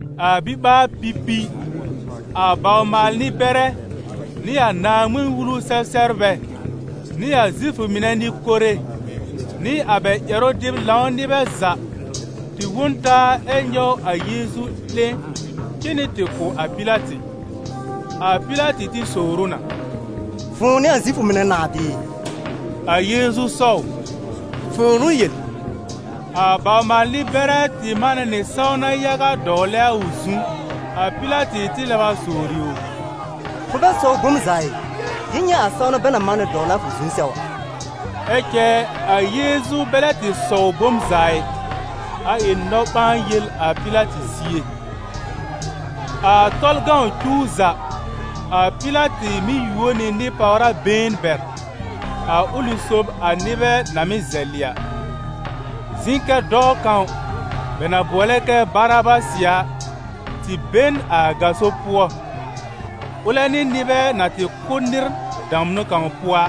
A biɓaar-pipi, a bawr-maal-nɩ-bɛrɛ, nɩ a Naaŋmɩn-Wulu-sɛ-sɛbrbɛ, nɩ a Zifʋ mɩnɛ nɩ-kore, nɩ a bɛ ƴɛrʋ-dɩb-lãw nɩbɛ za, tɩ wõ n taa ɛ nyɔw a Yeezu 'lẽ cen nɩ tɩ kʋ̀ a Pɩlatɩ. A Pɩlatɩ tɩ sowr ʋ na: «Fʋ̃ʋ n'ɩ a Zifʋ mɩnɛ nãà bɩɩ?» A Yeezu sɔw: «Fʋ̃ʋ n'ʋ yel.» A bawr-maal-nɩ-bɛrɛ tɩ manɛ nɩ sãwna yaga dɔwlɛ a ʋ zu. A Pɩlatɩ tɩ lɛb a sowri ʋ: «Fʋ bɛ sɔwr bom za ɩ? Jɩr nyɛ̃ a sãwna bɛ na manɛ dɔwlɛ a fʋ zu sɛw a?» Ɛ cɛ a Yeezu bɛ lɛ tɩ sɔw bom za ɩ, a ɩ nɔ-ɓãa-yel a Pɩlatɩ zie. A Tɔlʋ cuw za, a Pɩlatɩ mɩ́ yuo nɩ nɩ-pàwra been bɛr, a ʋlɩ sob a nɩbɛ na mɩ́ zɛlɩ a. Zɩ̃ kɛ dɔɔ kãw, bɛ na bʋɔlɛ kɛ Barabasɩ a, tɩ be n a gaso pʋɔ, ʋlɛ nɩ nɩbɛ na tɩ kʋ́ nɩr damnʋ kãw pʋɔ a.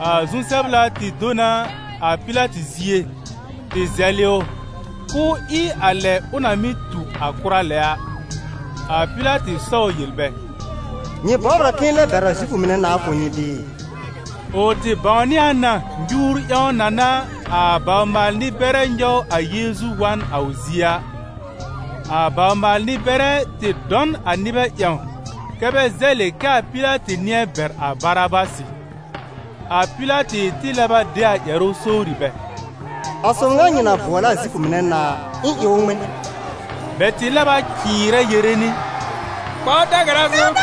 A zu-sɛbla tɩ do n a Pɩlatɩ zie tɩ zɛlɛ ʋ k'ʋʋ ɩ a lɛ ʋ na mɩ́ tu a kʋra lɛ a. A Pɩlatɩ sɔw yel bɛ: «Nyɩ bɔbr a k'ɩ̃ɩ lɛb bɛr a Zifʋ mɩnɛ nãà kʋ̀ nyɩ bɩɩ?» Ʋ tɩ bãwnɩ a na nyuur ƴãw na n'a a bawr-maal-nɩ-bɛrɛ nyɔw a Yeezu wa n a ʋ zie a. A bawr-maal-nɩ-bɛrɛ tɩ dɔ n a nɩbɛ ƴãw kɛ́ bɛ zɛlɩ kɛ a Pɩlatɩ nɩ̃ɛ bɛr a Barabasɩ. A Pɩlatɩ tɩ lɛb a de a ƴɛrʋ sowri bɛ: «A sob ŋa nyɩ na bʋɔlɛ a Zifʋ mɩnɛ nãà a, ɩ̃ ɩ ʋ ŋmɩn?» Bɛ tɩ lɛb a cɩɩrɛ yere nɩ: «Kpa ʋ da-gara zu!»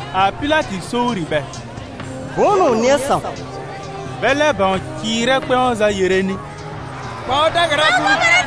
A Pɩlatɩ sowri bɛ: «Bʋ̃ʋ n'ʋ ʋ nɩ̃ɛ sãw?» Bɛ lɛb bãw cɩɩrɛ kpɛ̃w za yere nɩ: «Kpa ʋ da-gara zu!»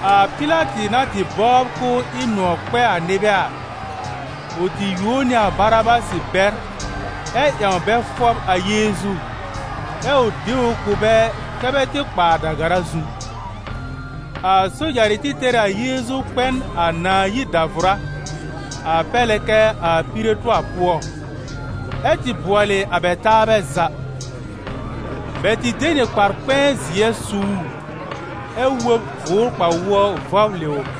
A Pɩlatɩ na tɩ bɔbr k'ʋʋ ɩ nʋ̃ɔ̀ kpɛ a nɩbɛ a, ʋ tɩ yuo nɩ a Barabasɩ bɛr ɛ ƴãw bɛ fɔb a Yeezu, ɛ ʋ de ʋ kʋ̀ bɛ kɛ́ bɛ tɩ kpa a da-gara zu. A sojarɩ tɩ tɛr ɩ a Yeezu kpɛ n a nãà yir dàvʋrá, a pɛr lɛ kɛ a piretʋar pʋɔ, ɛ tɩ bʋɔlɩ a bɛ taabɛ za. Bɛ tɩ de nɩ kpar-kpɛ̃ɛ zɩɛ su ʋ, ɛ wob gʋʋr kpa-wʋɔ vɔblɩ ʋ.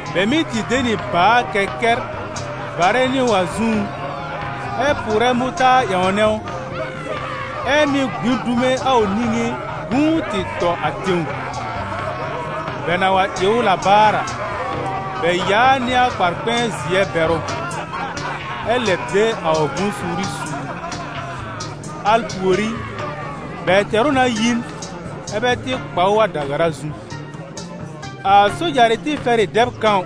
Bɛ mɩ́ tɩ de nɩ bàa-kɛkɛr varɛ nɩ ʋ a zũú, ɛ pʋʋrɛ mʋtaar ƴãwnɛ ʋ, ɛ mɩ́ gbĩ dume a ʋ niŋé gũu tɩ tɔ a tẽw. Bɛ na wa ɩ ʋ la baar a, bɛ yaa nɩ a kpar-zɩɛ bɛr ʋ, ɛ lɛb de a ʋ bʋ̃-suuri su ʋ. Al pùorí, bɛ tɛr ʋ na yi n, ɛ́ bɛ tɩ kpa ʋ a da-gara zu. A sojarɩ tɩ fɛr ɩ dɛb kãw,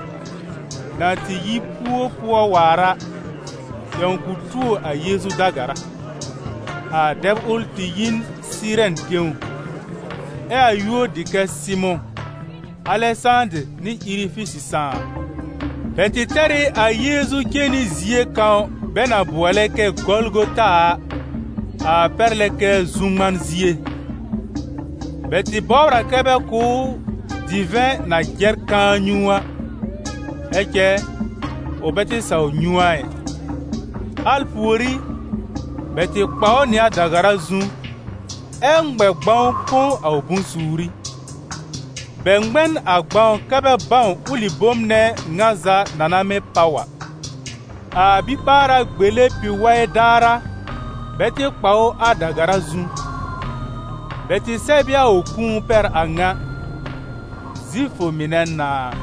na tɩ yi pu-pʋɔ waar a, ƴãw k'ʋ tuo a Yeezu da-gara. A dɛb ʋl tɩ yi n Sɩɩrɛn tẽw, ɛ a yúor dɩ kɛ Sɩmʋ̃, Alɛsãdɩr nɩ Irifisɩ sãà. Bɛ tɩ tɛr ɩ a Yeezu cen nɩ zie kãw bɛ na bʋɔlɛ kɛ Gɔlgɔta a, a pɛr lɛ kɛ zu-ŋman zie. Bɛ tɩ bɔbr a kɛ bɛ kʋ̀ ʋ divɛ̃ na jɛr kãa nyũu a, ɛ cɛ, ʋ bɛ tɩ saw nyũ a ɩ. Al pùorí, bɛ tɩ kpa ʋ nɩ a da-gara zu, ɛ ŋmɛ gbãw põ a ʋ bʋ̃-suuri. Bɛ ŋmɛ n a gbãw kɛ́ bɛ bãw ʋlɩ bom nɛ ŋa za na na mɩ́ páw a. A biɓaara gbele pi-waɩ daar a, bɛ tɩ kpa ʋ a da-gara zu. Bɛ tɩ sɛb ɩ a ʋ kũu pɛr a ŋa: «Zifʋ mɩnɛ nãà.»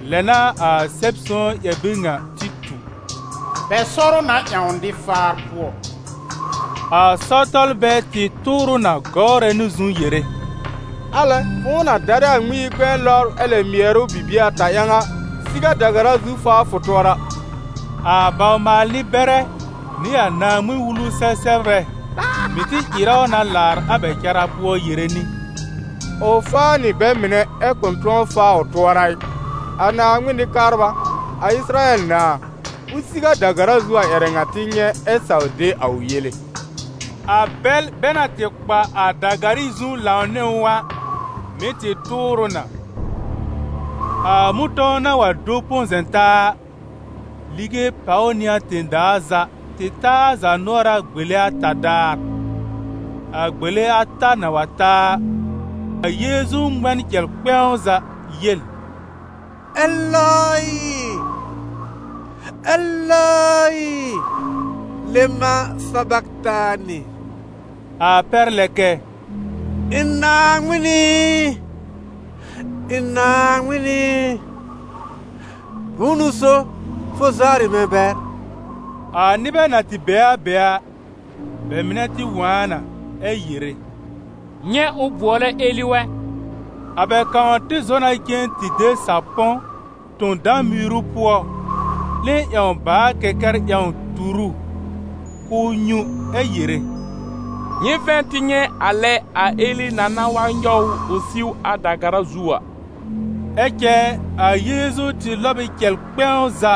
Lɛ n'a a Sɛb-sõw ƴɛr-bir ŋa tɩ tu: «Bɛ sɔr ʋ na ƴãw nɩ-faar pʋɔ.»] A sɔr-tɔlbɛ tɩ tʋʋr ʋ na gɔwrɛ nɩ zu yere: «Alɛ! Fʋ̃ʋ na darɛ a Ŋmɩn-yi-kpɛ̃ɛ lɔbr ɛ lɛb mɩɛr ʋ bibie ata ƴãw a, siw a da-gara zu faa fʋ tʋɔra!» A bawr-maal-nɩ-bɛrɛ, nɩ a Naaŋmɩn-Wulu-sɛ-sɛbrbɛ, mɩ̀ tɩ ɩrɛ ʋ na laar a bɛ cara pʋɔ yere nɩ: «Ʋ faa nɩ bɛ mɩnɛ ɛ kʋ̃ tʋ̃ɔ faa ʋ tʋɔra ɩ! A Naaŋmɩn Nɩ-kabra, a Ɩsɩrayɛl nãà, ʋ siw a da-gara zu a ƴɛrɛ ŋa tɩ nyɛ̃ ɛ saw de a ʋ yele.» A bɛl bɛ na tɩ kpa a da-garɩ zu lãw nɩ ʋ a, mɩ̀ tɩ tʋʋr ʋ na. A mʋ̃tɔ̃w na wa do põ-zɛ̃-taa a, lige pàw nɩ a tẽ-daa za tɩ ta a zaanʋɔra gbele ata daar. A gbele ata na wa ta a, a Yeezu ŋmɛ n cɛl kpɛ̃w za yel: «Elɔɩ, Elɔɩ, lema sabaktanɩ!» A pɛr lɛ kɛ: «Ɩ̃ Naaŋmɩn ɩ, ɩ̃ Naaŋmɩn ɩ, bʋ̃ʋ n'ʋ so fʋ zawrɩ mɛ̃ bɛr?» A nɩbɛ na tɩ be a be a, bɛ mɩnɛ tɩ wõ a na ɛ yere: «Nyɛ̃ ʋ bʋɔlɛ Eli wɛ!» A bɛ kãw tɩ zɔ na cen tɩ de sapɔ̃ tõ dã-miiru pʋɔ, 'lẽ ƴãw bàa-kɛkɛr ƴãw tur ʋ k'ʋʋ nyũ, ɛ́ yere: «Nyɩ vɛ̃ tɩ nyɛ̃ a lɛ a Eli na na wa nyɔw ʋ ʋ siw a da-gara zu a!» Ɛ cɛ a Yeezu tɩ lɔb ɩ cɛl kpɛ̃w za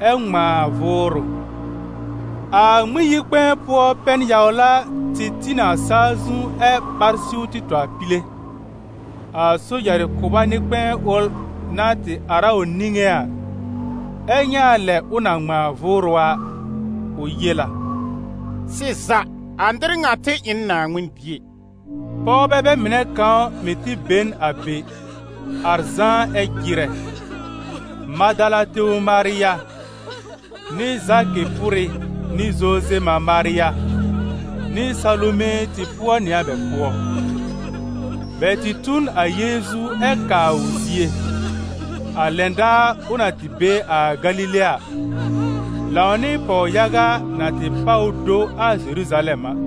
ɛ ŋmãa a vʋʋrʋ. A Ŋmɩn-yi-kpɛ̃ɛ pʋɔ pɛn-yawla tɩ tĩ nɩ a saa zu ɛ ɓar siw tɩ tɔ a pile. A sojarɩ kʋba nɩ-kpɛ̃ɛ ʋl na tɩ ar a ʋ niŋé a, ɛ nyɛ̃ a lɛ ʋ na ŋmãa a vʋʋrʋ a, ʋ yel a: «Sɩza, a nɩr ŋa tɩ ɩ n Naaŋmɩn Bie!» Pɔwbɛ bɛ mɩnɛ kãw mɩ̀ tɩ be n be, ar zãá ɛ jɩrɛ: Madala tẽw Marya, nɩ Zakɩ pʋrɩ nɩ Zoze mã Marya, nɩ Salume tɩ pʋɔ nɩ a bɛ pʋɔ; bɛ tɩ tu n a Yeezu ɛ kaa ʋ zie, a lɛn daar ʋ na tɩ be a Galile a, lãw nɩ pɔw-yaga na tɩ páw ʋ do a Zeruzalɛm a.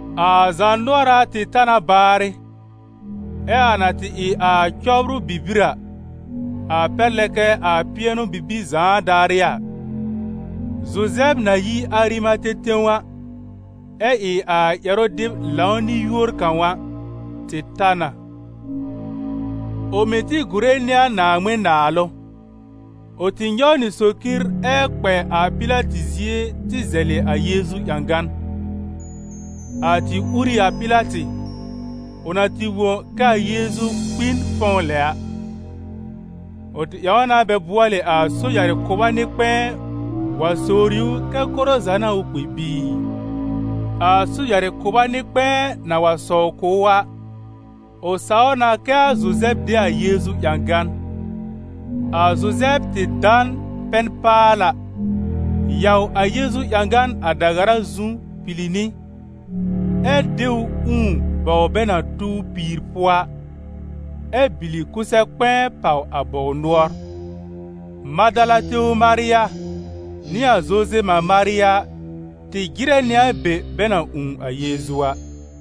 A zaanʋɔra tɩ ta na baarɩ, ɛ a na tɩ ɩ a cɔbrʋ bibir a, a pɛr lɛ kɛ a pɩɛnʋ-bibir zãa daarɩ a, Zuzɛb na yi Arimate tẽw a, ɛ ɩ a ƴɛrʋ-dɩb-lãw nɩ-yúor kãw a, tɩ ta na. Ʋ mɩ́ tɩ gùre nɩ a Naaŋmɩn-Naalʋ. Ʋ tɩ nyɔw nɩ socir ɛ kpɛ a Pɩlatɩ zie tɩ zɛlɩ a Yeezu ƴãgan. A tɩ ur ɩ a Pɩlatɩ, ʋ na tɩ wõ kɛ a Yeezu kpi n fɔ̃w lɛ a. Ʋ tɩ ƴãw na bɛ bʋɔlɩ a sojarɩ kʋba nɩ-kpɛ̃ɛ wa sowri ʋ kɛ koro za n'a ʋ kpi bɩɩ. A sojarɩ kʋba nɩ-kpɛ̃ɛ na wa sɔw kʋ̀ ʋ a, ʋ saw na kɛ a Zuzɛb de a Yeezu ƴãgan. A Zuzɛb tɩ da n pɛn-paala, yaw a Yeezu ƴãgan a da-gara zu pili nɩ, ɛ́ de ʋ ũù bɔw bɛ na tuw piìr pʋɔ a, ɛ bìlì kʋsɛ-kpɛ̃ɛ pàw a bɔw nʋɔr. Madala tẽw Marya nɩ a Zoze mã Marya tɩ jɩrɛ nɩ a be bɛ na ũù a Yeezu a.